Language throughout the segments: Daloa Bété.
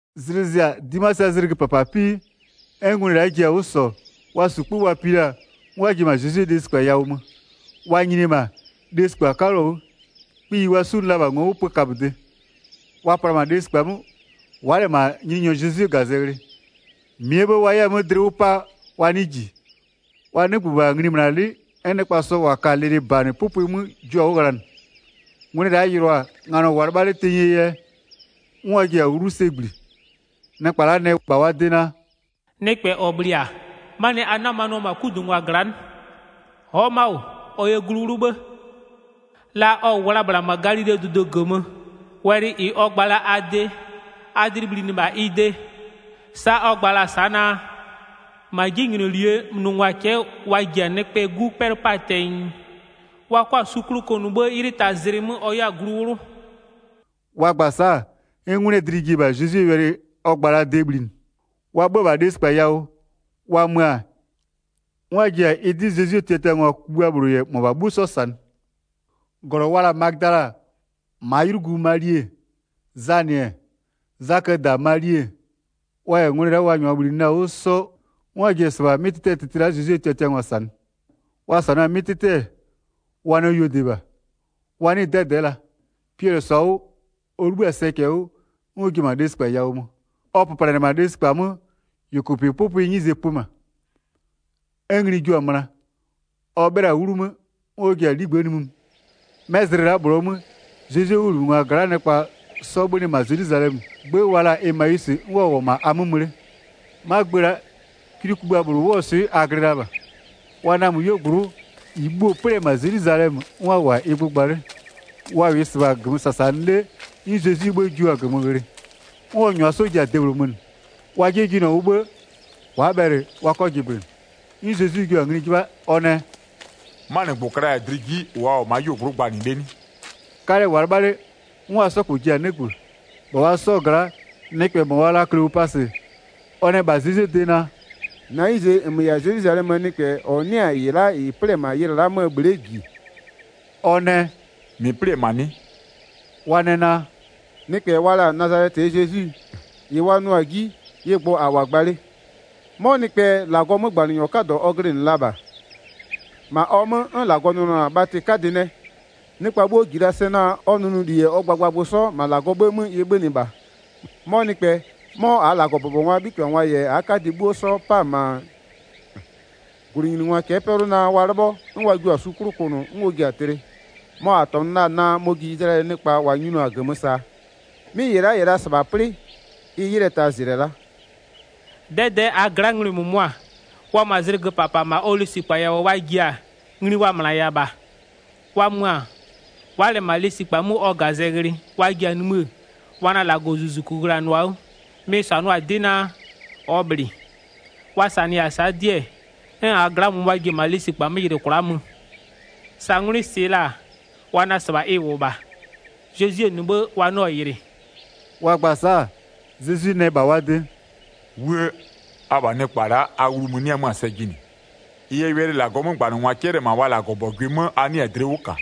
Zlɩ zɩ-a, 'dimasɩɛ zlɩgö -papa 'pii, 'n ngwlɩ la'a ji-a 'wʋ -sɔ, wa -su 'kpö wa pi la-a, 'n wa ji-e -ma Zezwie lesikpa yawʋ mö. Wa nyini-e -ma, lesikpa 'kaluo 'wʋ, kpiyi wa 'sunʋ la-a -bha ngo'o 'wʋ pö kaböde. Wa pla-a -ma lesikpa 'mö, wa'a -lɛ -ma Nyininyɔ Zezwie -gazɛ ghlɩ. 4-Mɩɛ 'bhë wa 'yɛ-a 'mö dlɩ 'wʋ 'pa wa 'nɩɩ -ji, wa 'nɩgbö -bha nglimönalɩ'ɩ 'n nɩkpa sɔ -wa ka-a lɩlɩbanɩ 'pʋpʋɩ 'mö jua-a 'wʋ ghlanɩ. Ngwlɩ la'a yɩlʋa-a, nganɔ -wʋʋa-a 'lɩbha 'le tenyie yɛ, 'n wa ji-a 'wlu sɛ -gbli. Nɩkpa la'a nɛ -bha wa de naa: “Nɩkpɛ -ɔ -bhlɩ-a, 'manɩɛ yɛ a 'namanɩɔ-ɔ -ma 'kudungwa gla'a 'nɩ? Ɔ'ɔ ma'a -wʋ. Ɔ yɛ glu 'wlʋ 'bhë, la ɔ -wʋ la-a -bhla -ma Galilee dʋdʋ -gömö, wɛlɩ -ɩ ɔ gba la-a a de, a dlɩ bhlinɩ -bha ɩ de. Sa'a ɔ gba la-a sa'a naa: -Ma 'jinylolie nʋngwa cɛ'ɛ wa ji-a Nɩkpɛɛ 'Gu 'pɛlʋ 'paa tɛnyɩ, wa 'kɔ-a su 'klʋ kʋnʋ 'bhë 'ylɩɛ tazlɩ 'mö ɔ 'yɛ-a glu 'wlʋ.” Wa gba-a sa'a, 'n 'ngwlɩɛ dlɩ ji-e -bha Zezwie wɛlɩ ɔ gba la-aa de bhlinɩ. Wa 'bhö-ö -ma lesikpa yawʋ, wa mö-a, -ɩ la'a wa yɩlɩ-ɛ -ma, 'n wa ji-a ɩ 'dɩ Zezwie tiatiangwa kugbïa -bhlʋ -yɛ -mʋabha 'bhuo 'sɔ -sanɩ. 10-Glɔ wa la-a Magödala, -maa 'ylugu Mali-e, Zanɩ-ɛ, Zaköö -da Mali-e, wa -yɛ 'ngwlɩ la'a -wa -nyʋa -bhlinɩ la-a 'wʋ 'sɔ 'n wa ji-e -sɩbha 'mɩ tɩtɩ la'a Zezwie tiatiangwa -sanɩ. Wa -sanʋa-a 'mɩ 'tɩtɩ, wa nɛ yuodɩ -bha, wa 'nɩɩ-ɩ 'dɛdɛ'ɛ la. Piɛlɩ -sɔ-a 'wʋ, ɔ 'libhï-a sɛcɛ 'wʋ, 'n ɔ ji-e -ma lesikpa yawʋ mö. Ɔ nyini-e -ma, ɔ pöplanɩ-ɛ -ma lesikpa 'mö, -yʋkʋpɩ 'pʋpʋɩɛ 'nyize pö -ma. 'N ngli jio-a möna, ɔ 'bhɩla-a 'wlu 'mö 'n ɔ ji-a 'ligbë'ë nimï mö. 'Mɛ zlɩ la'a -bhlʋɔ 'mö, Zezwie 'wʋbhlinɩngwa gla'aa nɩkpa 'sɔ 'bhönɩ -ma Zelwizalɛmö, 'gbë wa la-a Emawisɩ, 'n wa -wʋ-ɔ -ma a 'mö mö 'le. 'Ma gbë la'a, kwli kugbïa -bhlʋ 'wʋɔ swɩ a glɩ la -bha. Wa namö 'yuogblʋ'ʋ, -ɩ bhuo-o 'plɩ-ɛ -ma Zelwizalɛmö, 'n wa -wʋ-a ɩ gbʋ gba 'le. Wa -wʋɩ -sɩbha -gömö -sasanɩ 'le 'n Zezwie 'bhë jua-a -gömö ghlɩ, 'n ɔ -nyʋa 'sɔ ji-a debhlʋ mönɩ. Wa 'jie jɩnɩɔ 'wʋ 'bhë, wa'a bhɛlɩ wa 'kɔ jɩblɩnɩ. 'N Zezwi jua-a ngli 'jɩbha ɔ nɛ: “'Manɩgbʋ klaya-a dlɩ 'ji, -ʋ a -wʋ-ɔ ma'a 'yuogblʋ'ʋ gbanɩ 'le 'nɩ?” 'Kalɛ -wʋʋa 'lɩbha 'le 'n wa 'sɔ -kpɔ ji-a 'nɩgbö. 18-Bha wa 'sɔ gla'aa nɩkpɛ -mɔ wa la-a Kleopasɩ, ɔ nɛ -bha Zezwie de naa: “-Na 'nyize -nmö -yɛ-a Zelwizalɛmöö nɩkpɛ -ɔ 'nɩ-a -ɩ la'a -ɩ 'plɩ-ɛ -ma ylɩ la'aa 'möö bhle'e -ji.” Ɔ nɛ: “-Mɩ 'plɩ-ɛ -ma 'nɩ?” Wa nɛ naa: “Nɩkpɛ wa la-a Nazalɛtɩɛ Zezwi, -ɩ wa nʋɔ-a 'ji, ɩ gbʋ -a -wʋ-a gba 'le, 'mɔ nɩkpɛ, -Lagɔɔ 'mögbanɩnyɔ 'kadɔ ɔ glɩnɩ la -bha. -Ma ɔ 'mö 'n -Lagɔ nʋnʋ-ɔ -ma bhatɩ 'kadɩ nɛ. Nɩkpa 'bhuo -ji la sɛ naa ɔ nʋnʋli -yɛ ɔ gbagbagbʋ 'sɔ, -ma -Lagɔɔ 'bhë 'mö ɩ 'bhönɩ -bha. 'Mɔ nɩkpɛ 'mɔ -aa -Lagɔbʋbɔngwaa 'bhitɩbhangwa -yɛ -aa 'kadɩ 'bhuo 'sɔ 'pa-a -ma -gwlɩnyiningwa cɛ'ɛ 'pɛlʋ naa wa 'lɩbhɔ, 'n wa jio-a su 'klʋ kʋnʋ, 'n ɔ ji-a tlɩ. Mɔ -a -tɔnʋ la-a naa mɔ-ɔ ji Izlayɛlɩɛ nɩkpa -wa nyinʋa-a -gömö -saa. 'Mɩ -ɩ la'a -yɛ la -sɩbha 'plɩ ɩ 'ylɩɛ tazlɩ-ɛ la'a. 'Dɛdɛ'ɛ -aa gla'aa ngwlɩ -mʋmʋa, -wa mö-a zlɩgö -papa -ma ɔ lesikpa yawʋ wa ji-a, ngli wa -mönaya -bha. Wa mö-a, wa'a -lɛ-ɛ -ma lesikpa 'mö ɔ -gazɛ ghlɩ-ɛ, wa ji-a nimï wa nɛ -Lagɔzuzuku ghlanʋa-a 'wʋ, mɩ-ɩ -sanʋa-a 'dɩ naa, ɔ -bhlɩ. Wa -sanɩya-a sa'a 'dɩ-ɛ, 'n -aa gla'aa -mʋmʋa-a ji-e -ma lesikpa 'mö yɩlɩ kwla'a 'mö. Sa 'ngwlɩ -sɩɩ la-a, wa nɛ -sɩbha ɩ -wʋ -bha. Zezwie -nɩ 'bhë wa 'nɩɔ-ɔ yɩlɩ.” Wa gba-a sa'a, Zezwi nɛ -bha wa de: “'Wuë! Abha nɩkpa la'a, a wlu mö-ö 'nɩ-ɛ 'mö-a sɛ jɩnɩ. Ɩ yɛ wɛlɩ -Lagɔɔ 'mögbanɩngwa 'cɛlɩ-ɛ -ma wa -Lagɔbɔgʋɩ 'mö a 'nɩɩ-a dlɩ 'wʋ -ka.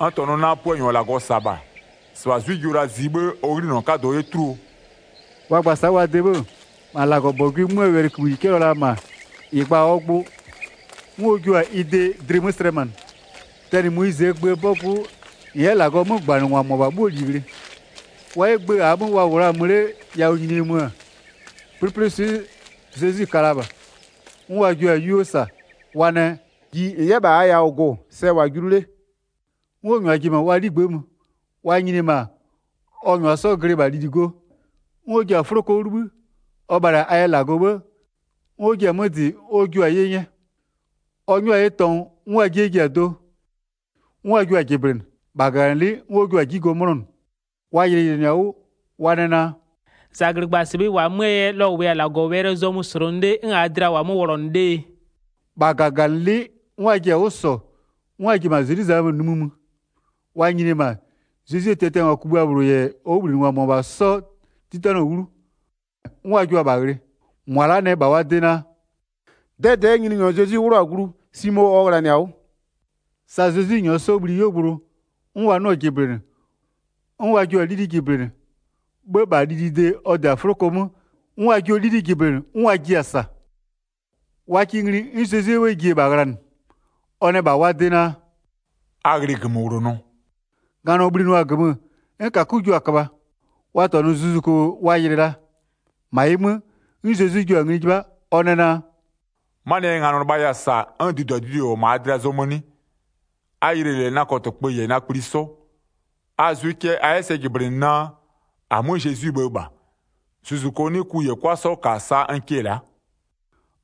N -tɔnʋ naa, Puanyɔ -ɔ -Lagɔ -sa-a -bha, -sɩbha 'zwɩ jio la zie, 'bhë ɔ 'ghlinɔ 'kadʋ 'yɛ 'tuluo?” Ɔ gba-a sa'a wa de 'bhë-ë, -ma -Lagɔbɔgʋɩ 'möö wɛlɩkïbhï -ɩ 'cɛlɩɔ-ɔ -ma, -ɩ gba-a ɔ gbʋ, 'n ɔ jua-a ɩ de dlɩ 'mö slɛmanɩ. Tɛnɩ Moyizɩɛ gböö 'bɔgʋ 'wʋ -n 'yɛ -Lagɔɔ 'mögbanɩngwa -mʋabha 'bhuoo -li ghlɩ. Wa 'yɛ gbë -aa 'mö wa -wʋ la-a mö 'le yawʋ nyinie mö-ö, 'plɩplɩswɩ'ɩ Zezwi ka la -bha. 'N wa jio-a 'yuo -sa, wa nɛ: “Ji -n 'yɛ -bha -aa yawʋ gʋ-ʋ, sɛ -wʋ-a julu 'le.” 'N ɔ jiɩ-a 'wʋ nglu, 'n ɔ -nyʋa ji-e -ma wa 'ligbë'ë mö. Wa nyini-e -ma, ɔ -nyʋa 'sɔ glɩ -bha lili go, 'n ɔ ji-a 'fʋloko 'wʋ 'libhï, ɔ bhalɩ-a a yɛ -Lagɔ 'bhë, 'n ɔ jia-a 'mö -dɩ 'n ɔ jua-a 'ye 'nyɛ. Ɔ 'nyʋa-a 'ye tɔngʋ, 'n wa 'jie ji-a do, 'n wa jio-a jɩblɩnɩ. -Bha -gaganɩlɩ'ɩ 'n ɔ jua-a 'ji go 'mʋnɔnʋ. Wa yɩlɩyɩlɩnɩ-a 'wʋ, wa nɛ naa: “-Zɛglɩgba-a -sɩbha ɩ -wʋ-a 'möö yɛ la ɔ -wʋya-a -Lagɔwɛlɩɛ zɔmö -slʋnʋ 'le 'n -aa dlɩa -wʋ-a 'mö wlɔnʋ 'lee?” 33-Bha -gaganɩlɩ'ɩ 'n wa ji-a 'wʋ -sɔ, 'n wa ji-e -ma Zelwizalɛmö nimï mö. Wa nyini-e -ma, Zezwie tiatiangwa kugbïa -bhlʋ -yɛ ɔ 'wʋbhlinɩngwa -mʋabha 'sɔ 'titanɩɔ-ɔ 'wlu, 'n wa jua-a -bha ghlɩ. 34-Mʋa la'a nɛ -bha wa de naa: “'Dɛdɛ'ɛ Nyininyɔ Zezwi 'wlʋ-a glu, Simo ɔ ghlanɩ-a 'wʋ.” Sa Zezwi -nyʋa 'sɔ bhli 'yuogblʋ, 'n wa 'nɩɔ-a jɩblɩnɩ, 'n wa -nyɔɔ ji 'gbë 'mö nyini, 'bhë -bha lilide ɔ -dɩ-a 'fʋloko 'mö 'n wa jio 'lili'i jɩblɩnɩ, 'n wa jiɩ-a -sa. Wa kɩ ngli, 'n Zezwie 'bhë ji-e -bha ghlanɩ. Ɔ nɛ -bha wa de naa: “A ghlɩ -gömöwlonɔ.” Nganɔ bhlinʋa-a -gömö, 'n -kakö jua-a köbha. Wa -tɔnʋ zuzuko wa yɩlɩ la. 38-Ma ɩ 'mö, 'n Zezwi jua-a ngli 'jɩbha, ɔ nɛ naa: “'Manɩɛ yɛ nganɔ lɩbhaya-a -sa 'n duduadudue -wʋ-ɔ -ma a dlɩa zɔmö 'nɩ? A yɩlɩ -lɛ na kɔtɩkpö -yɛ na kpli 'sɔ. A zʋɩ cɛ a 'yɛ sɛ jɩblɩnɩ naa -amö Zezwie bhë -bha, zuzuko 'nɩ ku -yɛ 'kwa 'sɔ -ka sa n kɩ-ɛ la'a.”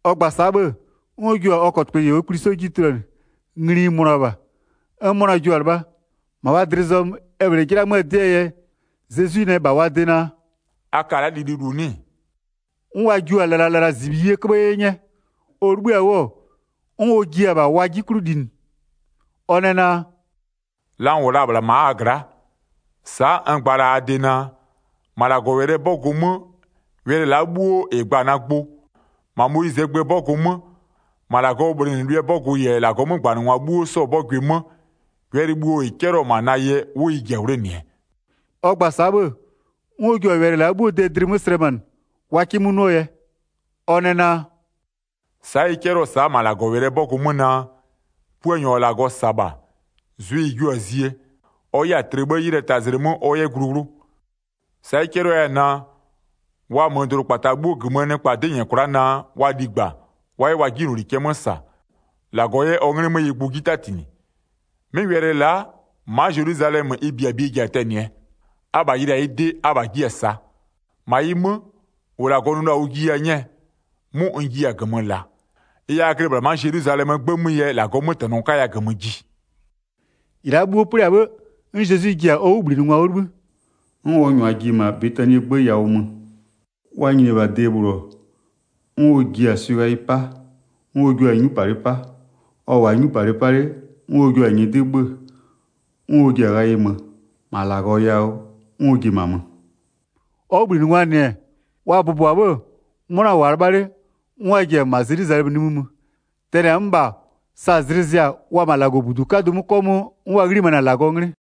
Ɔ gba-a sa'a 'bhë, 'n ɔ jua-a ɔ kɔtɩkpö -yɛ ɔ kpli 'sɔ 'ji tuluanɩ. Ngli-i mönʋa -bha, 'n 'mʋna jua-a 'lɩbha, -ma wa dlɩ zɔmö e -bhlee 'jɩla 'möö 'dɩɛ yɛ, Zezwi nɛ -bha wa de naa: “A ka la'a lililu 'nɩ-ɩ?” 'N wa jio-a lɩlalɩlazibhiyie 'köbhë 'ye 'nyɛ. Ɔ 'libhïa-a 'wʋ, 'n ɔ jia-a -bha wa 'ji 'klʋ linɩ. Ɔ nɛ naa: “La n -wʋ la-a -bhla ma'a a gla'a, sa'a n gba la-a a de naa: -Ma -Lagɔwɛlɩɛ 'bɔgʋ 'mö, wɛlɩ la'a 'bhuo -ɩ gba-a na gbʋ, -ma Moyizɩɛ gböö 'bɔgʋ 'mö, -ma -Lagɔɔ bhlɩnɩlʋɩɛ 'bɔgʋ -yɛ -Lagɔɔ 'mögbanɩngwa 'bhuo 'sɔɔ 'bɔgʋɩ 'mö, wɛlɩ bhuo -ɩ 'cɛlɩɔ-ɔ -ma na yɛ 'wʋ ɩ ji-a 'wlenɩɛ.” Ɔ gba-a sa'a 'bhë, 'n ɔ jua-a wɛlɩ la'a 'bhuoo de dlɩ 'mö slɛmanɩ wa 'kɩ 'mö 'nʋɔ yɛ. Ɔ nɛ naa: “Sa'a ɩ 'cɛlɩɔ-ɔ sa'a -ma -Lagɔwɛlɩɛ 'bɔgʋ 'mö naa: Puanyɔ -ɔ -Lagɔ -sa-a -bha, zwɩ-ɩ jio-a zie, ɔ 'yɛ-a tlɩ 'bhë 'ylɩɛ tazlɩ 'mö ɔ 'yɛ glu 'wlʋ. Sa'a ɩ 'cɛlɩɔ 'yɛ-ɛ -ma naa, wa mö dʋdʋkpata 'bhuo -gömöö nɩkpa 'dɩ -nyɛ kwla'a naa, wa ligba, wa 'yɛ wa 'jinyloli cɛ 'mö -sa, -Lagɔ 'yɛ ɔ 'nglɩ 'mö ɩ gbʋ 'ji 'tatinɩ. 'Mɩ wɛlɩ la'a, ma'a Zelwizalɛmö ɩ -biabie ji-a tɛnɩɛ. 48-Abha yɩlɩ-a ɩ de, abha jiɩ-a -saa. 49-Ma ɩ 'mö, -ʋ -Lagɔ nʋ la-a ʋ jiya 'nyɛɛ, 'mʋ n jiya-a -gömö -laa. Ɩ yɛ a glɩ -bhla ma'a Zelwizalɛmöö 'gbë 'mö yɛ -Lagɔɔ 'mötɛnɔ 'kaya -gömö ji.” Zezwi yɛ -ma -Lagɔ yawʋ mö 50-Ɩ la'a 'bhuo 'plɩ-a 'bhë, 'n Zezwi ji-a ɔ 'wʋbhlinɩngwa 'wʋ 'libhï, 'n ɔ -nyʋa ji-e -ma Betanie 'gbë yawʋ mö. Wa nyinie-e -bha de -bhlʋ-ɔ, 'n ɔ ji-a swɩ ghayɩ 'pa, 'n ɔ jua-a 'nyupalɩ 'pa. Ɔ -wʋʋa 'nyupalɩ 'pa 'le, 'n ɔ jua-a nyɩdɩ 'bhö-ö, 'n ɔ ji-a ghayɩ 'mö, -ma -Lagɔ yawʋ, 'n ɔ ji-e -ma mö. Ɔ 'wʋbhlinɩngwaa -nɩ-ɛ, wa bʋbɔ-a 'bhë-ë, 'mʋna -wʋʋa 'lɩbha 'le, 'n wa ji-e -ma Zelwizalɛmö nimï mö. Tɛnɩ-a 'mö -bha, sa zlɩ zɩ-a, wa-a -ma -Lagɔbudu 'kadʋ 'mö 'kɔmʋʋ, 'n wa 'ghlimanɩ-a -Lagɔɔ 'nglɩ.